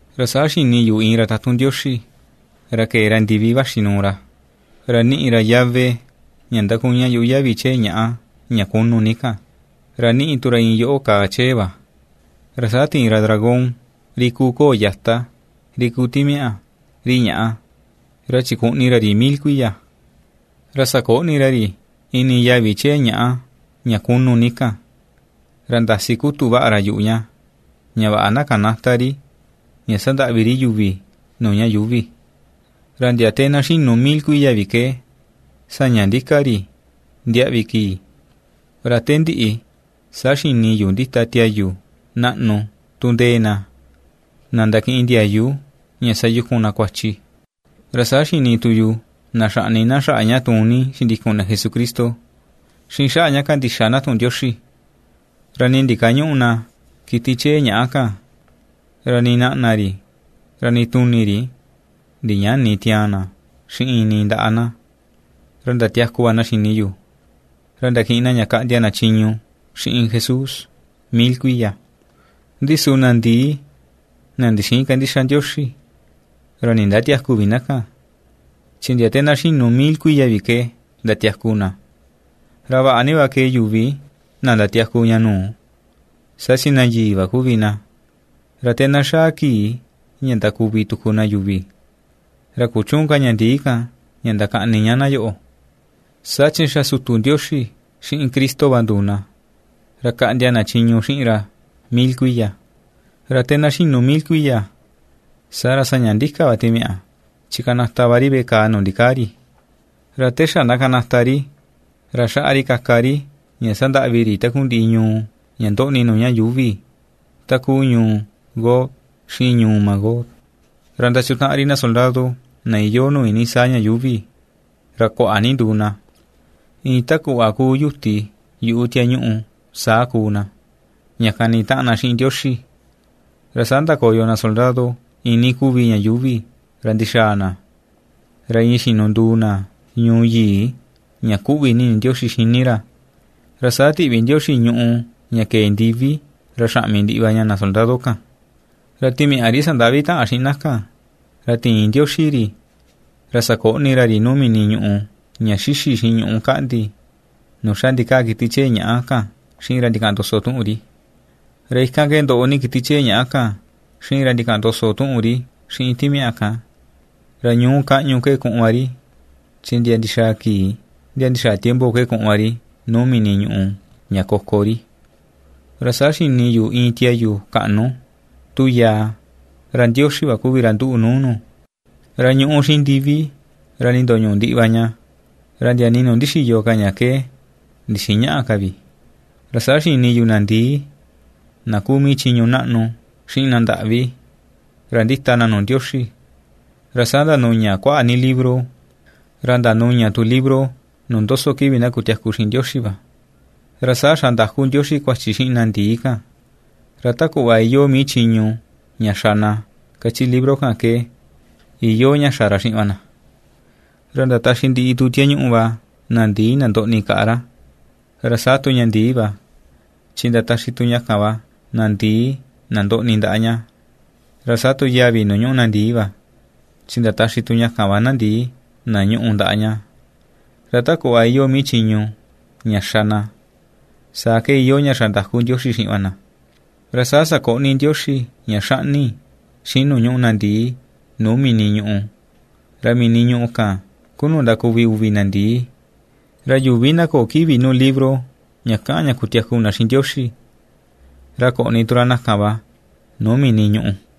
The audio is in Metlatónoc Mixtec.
Ra saa xini yu iin ra tatun Ndioxi, ra kee ra ndivi vaxi nuu ra, ra ^niꞌi ra yave ña ndakuña yuꞌu yavi chee ñàꞌa ña kunu ni kan, ra ^niꞌi tu ra iin yoꞌo kàà chee va. Ra saa tiin ra dragón ri kuu koo yata, ri kuu timiaꞌa, ri ñàꞌa, ra chikuꞌni ra ri mil kuiya. Ra sakoꞌni ra ri ini yavi chee ñàꞌa ña kunu ni kan, ra ndasi kutu vaꞌa ra yuꞌu ña, ña vaꞌa na kanäta ri ña sandaꞌvi ri yuvi nuu ña yuuvi, ra ndia te na xinu mil kuiya vi ke, saña ndika ri ndiaꞌvi kii. Ra te ndiꞌi, saa xini yu ndita tiayu naꞌnu tu ^ndee na, na ndakiꞌin ndiayu ña ^sayuku na kuachi. Ra saa xini tu yu na xaꞌni na xaꞌa ña tuun ni xindikun na Jesucristo, xiꞌin xaꞌa ña kandixa na tuꞌun Ndioxi; ra nii ndikañüꞌu na kiti chee ñàꞌa kan, ra nii naꞌna ri, ra nii tuni ri ndiñäni tiaan na xiꞌin nii ndaꞌa na; ra ndatiaku va na xini yu, ra ndakiꞌin na ña kaꞌndia na chiñu xiꞌin Jesús mil kuiya. Ndi su na ndii, na ndixïin kandixa Ndioxi, ra nindatiäku vi na kan, chi ndia te na xinu mil kuiya vi ke ndatiaku na. Ra vaꞌa ni va kee yuvi na ndatiaku ña nuu, saa chi na yii va kuvi na. Ra te na xaa kii ña ndakuvi tuku na yuvi, ra kuchüun ka ña ndii kan ña ndakaꞌni ña na yoꞌo, saa chi xa sutu Ndioxi xiꞌin Cristo va nduu na, ra kaꞌndia na chiñu xiꞌin ra mil kuiya. Ra te na xinu mil kuiya, saa ra saña ndika va timiaꞌa chi kanata va ri veꞌe kaa nuu ndikaa ri. Ra te xa na kanata ri, ra xaꞌa ri kaka ri ña sandaꞌvi ri takundiꞌi ñuu ña ndoꞌni nuu ña yuuvi, takuu ñuu Gog, xiꞌin ñuu Magog. Ra ndachutaꞌan ri na soldado na iyoo nuu iinii saa ña yuuvi, ra kuaꞌa ni nduu na, iin ta kuꞌva kuu yuti yuꞌu tiañuꞌu saa kuu na, ña kani taꞌan na xiꞌin Ndioxi. Ra saa ndakoyo na soldado iinii kuvi ña yuuvi ra ndixaa na, ra iin xinunduu na ñuu yii, ña ^kuꞌvi ni ini Ndioxi xini ra. Ra saa tiꞌvi Ndioxi ñùꞌù ña kee ndivi ra xaꞌmi ndiꞌi va ña na soldado kan. Ra timiaꞌa, ri sandaꞌvi taꞌan xiꞌin na kan, ra tiin Ndioxi ri, ra sakoꞌni ra ri nuu mini ñuꞌu ña ^xixi xiꞌin ñuꞌú kaꞌndi, nuu xa ndikaa kiti chee ñàꞌa kan xiꞌin ra ndikaꞌan ndoso tuꞌun ri. Ra ikan ke ndoꞌo ni kiti chee ñaꞌa kan xiꞌin ra ndikaꞌan ndoso tuꞌun ri xiꞌin timiaꞌa kan. Ra ñuú, kaꞌñu ke kuꞌun va ri, chi ndia ndixaa kii, ndia ndixaa tiempo ke kuꞌun va ri nuu mini ñuꞌu ña koko ri. Ra saa xini yu iin tiayu kaꞌnu, tu yaa, ra Ndioxi va kuvi ra nduꞌu nuu nu, ra ñuꞌú xiꞌin ndivi, ra ndindoñuꞌu ndiꞌi va ña, ra ndia nii nuu ndixiyo ka ña ke, ndixïi ñaꞌa ka vi. Ra saa xini yu na ndii: na kuu mii chiñu naꞌnu xiꞌin na ndaꞌvi, ra ndita na nuu Ndioxi. Ra saa ndanuña kuaꞌa ni libro, ra ^ndanuña tu libro nuu ^ndoso kivi na kutiaku xiꞌin Ndioxi va. Ra saa xandaku Ndioxi kuachi xiꞌin na ndii kan, ra ta kuꞌva iyoo mii chiñu ña xa na kachi libro kan ke, iyoo ña xa ra xiꞌin va na. Ra ndataxi ndiꞌi tu tiañuꞌu va na ndii na ndoꞌni kaꞌa ra, ra saa tu ña ndii va, chi ndataxi tu ña kan va na ndii, na ndoꞌni ndaꞌa ña; ra saa tu yavi nuu ñuꞌu na ndii va, chi ndataxi tu ña kan va na ndii na ñuꞌu ndaꞌa ña. Ra ta kuꞌva iyoo mii chiñu, ña xa na, saa ke iyoo ña xandaku Ndioxi xiꞌin va na. Ra saa sakoꞌni Ndioxi ña xaꞌni, xiꞌin nuu ñúꞌu na ndii nuu mini ñùꞌù. Ra mini ñùꞌù kan ku nuu ndakuvi uvi na ndii. Ra yuvi na köo kivi nuu libro ña kaꞌan ña kutiaku na xiꞌin Ndioxi, ra koꞌni tu ra na kan va nuu mini ñùꞌù.